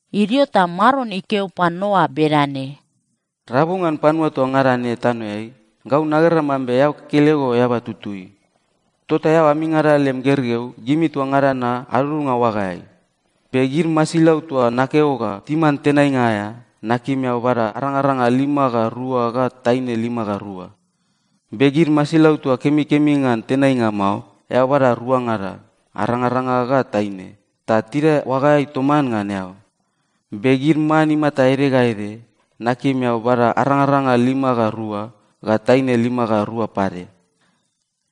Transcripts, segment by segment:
Idio ta Maron ikeo pan Noa bedane, “Rabu ngan panua toa ngada ne tanoeai, gau nagera mambe eao kekelego eaba tutui. Tota eao amingada lem gergeu, gimi toa ngada na adudunga oagaeai. Be gid masilau toa nakeo ga timan tenainga aea, nakim eao bada arangaranga lima ga rua ga taine lima ga rua. Be gid masilau toa kemikemi ngan tenainga mao, eao bada ruangada, arangaranga ga taine, ta tidae oagaeai toman ngan eao. Be gid man imata ede ga ede, nakim eao bada arangaranga lima ga rua, ga taine lima ga rua pade.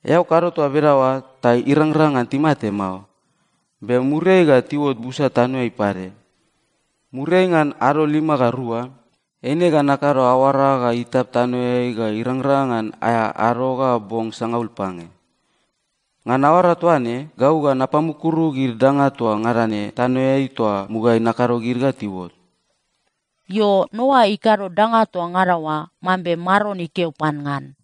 Eao kado toa bedaoa ta irangrang ngan timate mao, be muriai ga tiuot busa tanoeai pade. Muriai ngan ado lima ga rua, eine ga nakado aoara ga itap tanoeai ga irangrang ngan aea ado ga bong sangaul pange. Ngan aoara toa ne, gau ga napamukuru gid danga toa ngada ne tanoeai toa mugaeai nakado gid ga tiuot.” Io, Noa ikado danga toa ngada oa mambe Maron ikeo pan ngan.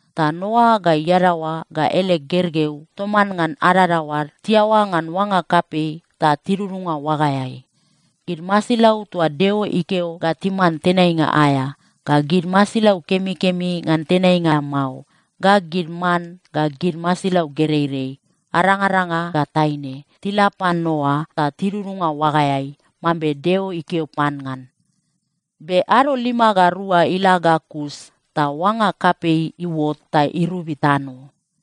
Ta Noa ga iadaoa ga ele gergeu toman ngan adadaoad tiaoa ngan oanga kapei ta tidudunga oagaeai. Gid masilau toa Deo ikeo ga timan tenainga aea, ga gid masilau kemikemi ngan tenainga mao, ga gid man ga gid masilau gereirei, arangaranga ga taine, tila pan Noa ta tidudunga oagaeai, mambe Deo ikeo pan ngan. Be ado lima ga rua ila ga kus ta oanga kapei iuot ta irobi tano.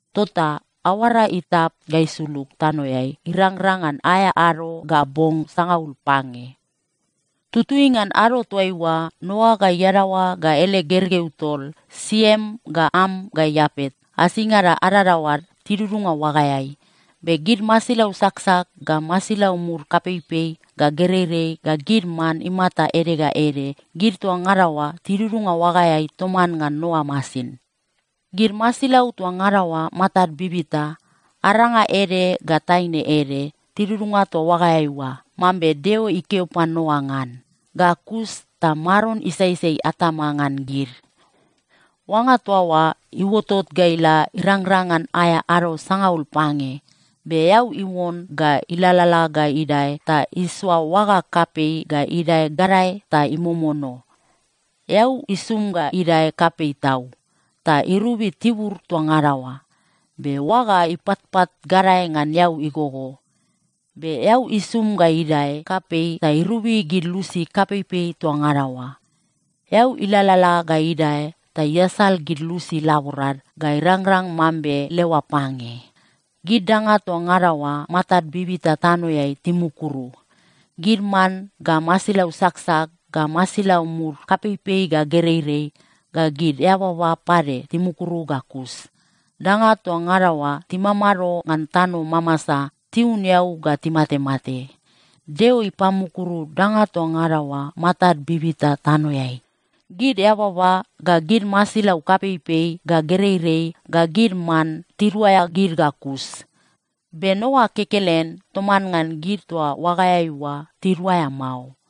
Tota aoara itap ga isulug tanoeai irangrang ngan aea ado ga bong sangaul pange. Tutui ngan ado toaiua, Noa ga iadaoa ga ele gergeu tol, Siem ga Am ga Iapet, asingada adadaoad tidudunga oagaeai. Be gid masilau saksak ga masilau mud kapeipei ga gereirei ga gid man imata ede ga ede, gid toa ngada oa tidudunga oagaeai toman ngan Noa masin. Gid masilau toa ngada oa matad bibita, aranga ede ga taine ede, tidudunga toa oagaeai oa, mambe Deo ikeo pan Noa ngan. Ga kus ta Maron isaisai atama ngan gid. Oanga toa oa iuotot ga ila irangrang ngan aea ado sangaul pange, be eau iuon ga ilalala ga idae ta isoa oaga kapei ga idae gadae ta imomono. Eau isum ga idae kapei tau ta irobi tibur toa ngada oa. Be oaga ipatpat gadae ngan eau igogo. Be eau isum ga idae kapei ta irobi gid lusi kapeipei toa ngada oa. Eau ilalala ga idae ta iasal gid lusi laborad ga irangrang mambe leoa pange. Gid danga toa ngada oa matad bibita tanoeai timukuru. Gid man ga masilau saksak ga masilau mud kapeipei ga gereirei ga gid eababa pade timukuru ga kus. Danga toa ngada oa timamado ngan tano mamasa, tiun eau ga timatemate. Deo ipamukuru danga toa ngada oa matad bibita tanoeai. Gid eababa ga gid masilau kapeipei ga gereirei ga gid man tiduaea gid ga kus. Be Noa kekelen toman ngan gid toa oagaeai oa tiduaea mao.